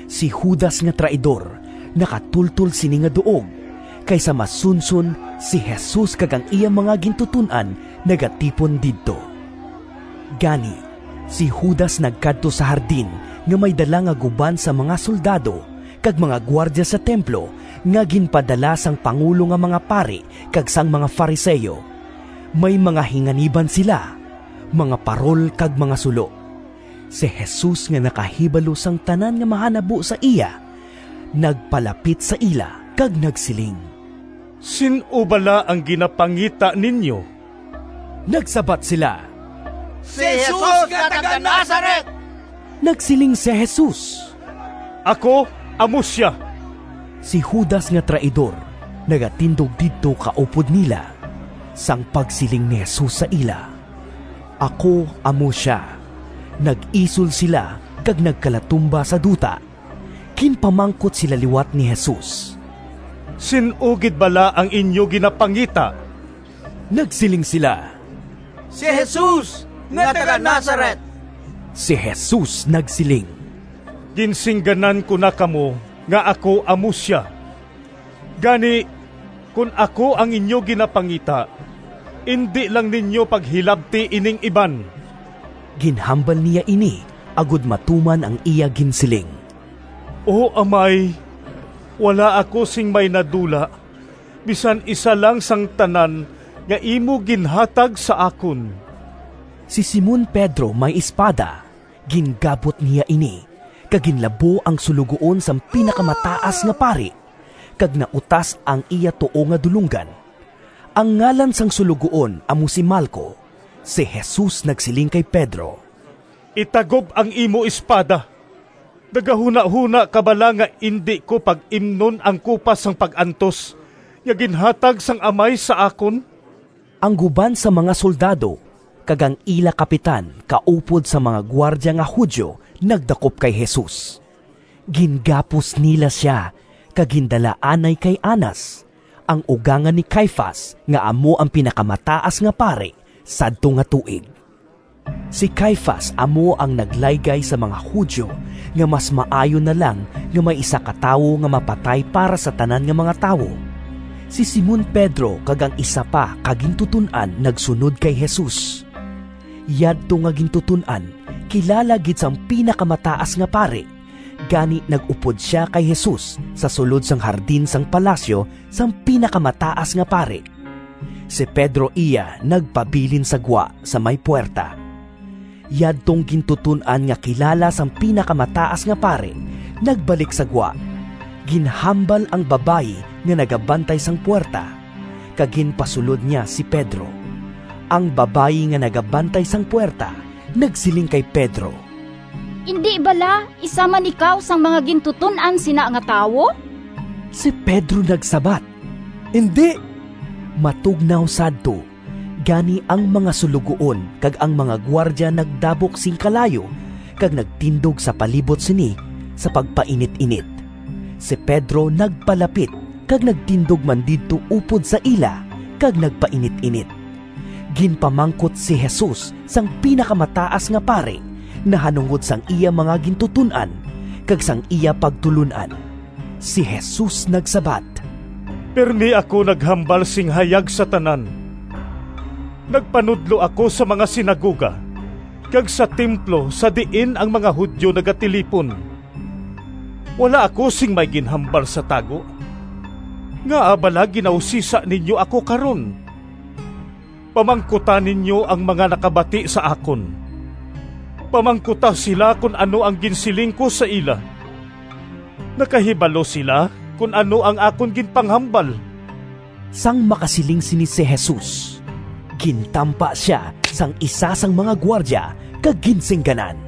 Si Judas nga traidor, nakatultol sini nga duog, kay sa masunson si Jesus kag ang iya mga gintuton-an nagatipon didto. Gani, si Judas nagkadto sa hardin nga may dala nga guban sang mga soldado kag mga gwardya sa templo nga ginpadala sang pangulo nga mga pari kag sang mga Fariseo. May mga hinganiban sila, mga parol kag mga sulo. Si Jesus nga nakahibalo sang tanan nga mahanabo sa iya, nagpalapit sa ila kag nagsiling, “Sin-o bala ang ginapangita ninyo?” Nagsabat sila, “Si Jesus nga taga-Nazaret.” Nagsiling si Jesus, “Ako amo sia.” Si Judas nga traidor nagatindog didto kaupod nila. Sang pagsiling ni Jesus sa ila, “Ako amo sia,” nag-isol sila kag nagkalatumba sa duta. Ginpamangkot sila liwat ni Jesus, “Sin-o gid bala ang inyo ginapangita?” Nagsiling sila, “Si Jesus nga taga-Nazaret.” Si Jesus nagsiling, “Ginsingganan ko na kamo nga ako amo sia. Gani, kon ako ang inyo ginapangita, indi lang ninyo paghilabti ining iban.” (Ginhambal niya ini agod matuman ang iya ginsiling, “O Amay, wala ako sing may nadula bisan isa lang sang tanan nga imo ginhatag sa akon.”) Si Simon Pedro may espada, gingabot niya ini kag ginlabo ang suloguon sang Pinakamataas nga Pari, kag nautas ang iya tuo nga dulonggan. Ang ngalan sang suloguon amo si Malco. Si Jesus nagsiling kay Pedro, “Itagob ang imo espada! Nagahunahona ka bala nga indi ko pag-imnon ang kupa sang pag-antos nga ginhatag sang Amay sa akon?” Ang guban sang mga soldado kag ang ila kapitan kaupod sang mga gwardya nga Judio nagdakop kay Jesus. Gingapos nila sia kag gindala anay kay Anas, ang ugangan ni Caifas nga amo ang Pinakamataas nga Pari sadto nga tuig. Si Caifas amo ang naglaygay sa mga Judio nga mas maayo na lang nga may isa ka tawo nga mapatay para sa tanan nga mga tawo. Si Simon Pedro kag ang isa pa ka gintuton-an nagsunod kay Jesus. Yadto nga gintuton-an kilala gid sang Pinakamataas nga Pari; gani nag-upod sia kay Jesus sa sulod sang hardin sang palasyo sang Pinakamataas nga Pari. Si Pedro iya nagpabilin sa gwa, sa may puwerta. Yadtong gintuton-an nga kilala sang Pinakamataas nga Pari nagbalik sa gwa, ginhambal ang babayi nga nagabantay sang puwerta, kag ginpasulod niya si Pedro. Ang babayi nga nagabantay sang puwerta nagsiling kay Pedro, “Indi bala isa man ikaw sang mga gintuton-an sina nga tawo?” Si Pedro nagsabat, “Indi.” Matugnaw sadto, gani ang mga suloguon kag ang mga gwardya nagdabok sing kalayo kag nagtindog sa palibot sini sa pagpainit-init. Si Pedro nagpalapit kag nagtindog man didto upod sa ila, kag nagpainit-init. Ginpamangkot si Jesus sang Pinakamataas nga Pari nahanungod sang iya mga gintuton-an kag sang iya pagtulon-an. Si Jesus nagsabat, “Pirme ako naghambal sing hayag sa tanan. Nagpanudlo ako sa mga sinagoga kag sa templo sa diin ang mga Judio nagatilipon. Wala ako sing may ginhambal sa tago. Ngaa bala ginausisa ninyo ako karon? Pamangkuta ninyo ang mga nakabati sa akon. Pamangkuta sila kon ano ang ginsiling ko sa ila—nakahibalo sila kon ano ang akon ginpanghambal.” Sang makasiling sini si Jesus, gintampa sia sang isa sang mga gwardya kag ginsingganan,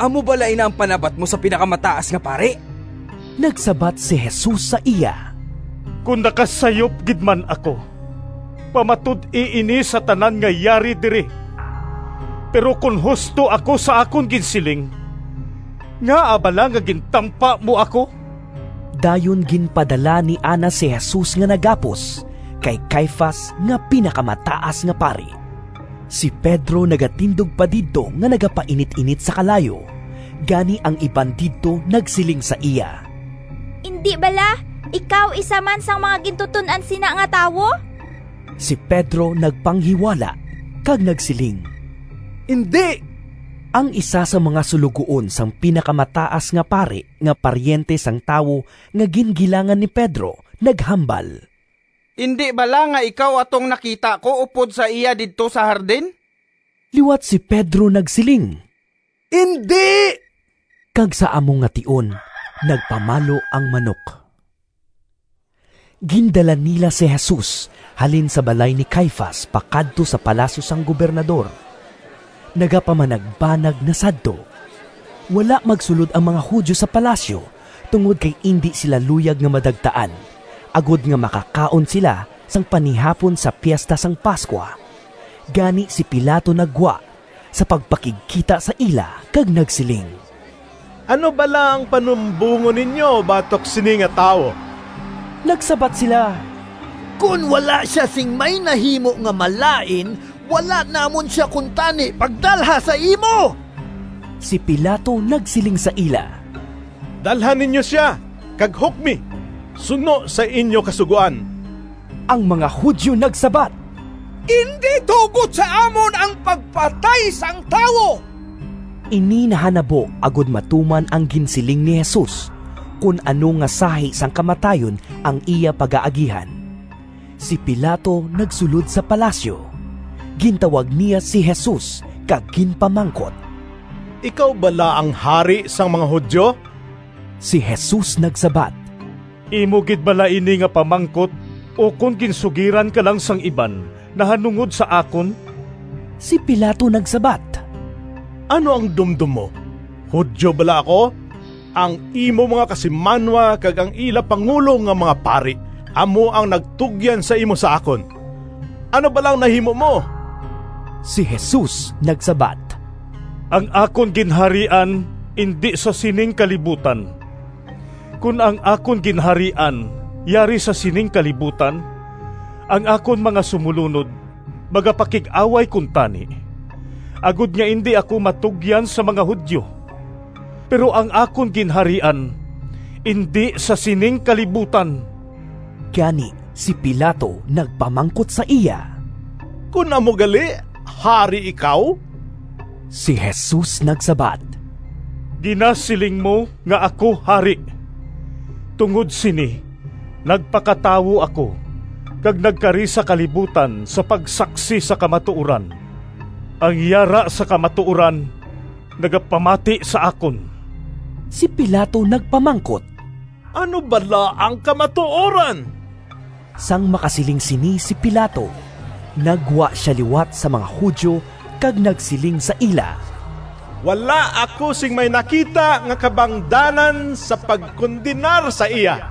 “Amo bala ina ang panabat mo sa Pinakamataas nga Pari?” Nagsabat si Jesus sa iya, “Kon nakasayop gid man ako, pamatud-i ini sa tanan nga yari diri. Pero kon husto ako sa akon ginsiling, ngaa bala nga gintampa mo ako?” Dayon ginpadala ni Anas si Jesus nga nagapos kay Caifas nga Pinakamataas nga Pari. Si Pedro nagatindog pa didto nga nagapainit-init sa kalayo. Gani ang iban didto nagsiling sa iya, “Indi bala ikaw isa man sang mga gintuton-an sina nga tawo?” Si Pedro nagpanghiwala kag nagsiling, “Indi.” Ang isa sang mga suloguon sang Pinakamataas nga Pari nga paryente sang tawo nga gingilangan ni Pedro, naghambal, “Indi bala nga ikaw atong nakita ko upod sa iya didto sa hardin?” Liwat si Pedro nagsiling, “Indi.” Kag sa amo nga tion nagpamalo ang manok. Gindala nila si Jesus halin sa balay ni Caifas pakadto sa palasyo sang Gobernador. Nagapamanagbanag na sadto. Wala magsulod ang mga Judio sa palasyo tungod kay indi sila luyag nga madagtaan, agod nga makakaon sila sang panihapon sa Piesta sang Pascua. Gani si Pilato naggwa sa pagpakigkita sa ila kag nagsiling, “Ano bala ang panumbongon ninyo batok sini nga tawo?” Nagsabat sila, “Kon wala sia sing may nahimo nga malain, wala namon sia kuntani pagdalha sa imo.” Si Pilato nagsiling sa ila, “Dalha ninyo sia kag hukmi suno sa inyo kasugoan.” Ang mga Judio nagsabat, “Indi tugot sa amon ang pagpatay sang tawo.” (Ini nahanabo agod matuman ang ginsiling ni Jesus kon ano nga sahi sang kamatayon ang iya pagaagihan.) Si Pilato nagsulod sa palasyo, gintawag niya si Jesus kag ginpamangkot, “Ikaw bala ang hari sang mga Judio?” Si Jesus nagsabat, “Imo gid bala ini nga pamangkot ukon ginsugiran ka lang sang iban nahanungod sa akon?” Si Pilato nagsabat, “Ano ang dumdom mo, Judio bala ako? Ang imo mga kasimanwa kag ang ila pangulo nga mga pari amo ang nagtugyan sa imo sa akon. Ano bala ang nahimo mo?” Si Jesus nagsabat, “Ang akon ginharian indi sa sining kalibutan. Kon ang akon ginharian yari sa sining kalibutan, ang akon mga sumolunod magapakig-away kuntani, agod nga indi ako matugyan sa mga Judio. Pero ang akon ginharian indi sa sining kalibutan!” Gani si Pilato nagpamangkot sa iya, “Kon amo gali, hari ikaw?” Si Jesus nagsabat, “Ginasiling mo nga ako hari. Tungod sini nagpakatawo ako kag nagkari sa kalibutan sa pagsaksi sa kamatuoran. Ang yara sa kamatuoran nagapamati sa akon.” Si Pilato nagpamangkot, “Ano bala ang kamatuoran?” Sang makasiling sini si Pilato, naggwa sia liwat sa mga Judio kag nagsiling sa ila, “Wala ako sing may nakita nga kabangdanan sa pagkondenar sa iya.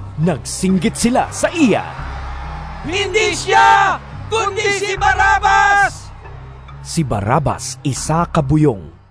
Nagsinggit sila sa iya, “Indi sia, kundi si Barrabas!” (Si Barrabas isa ka buyong.)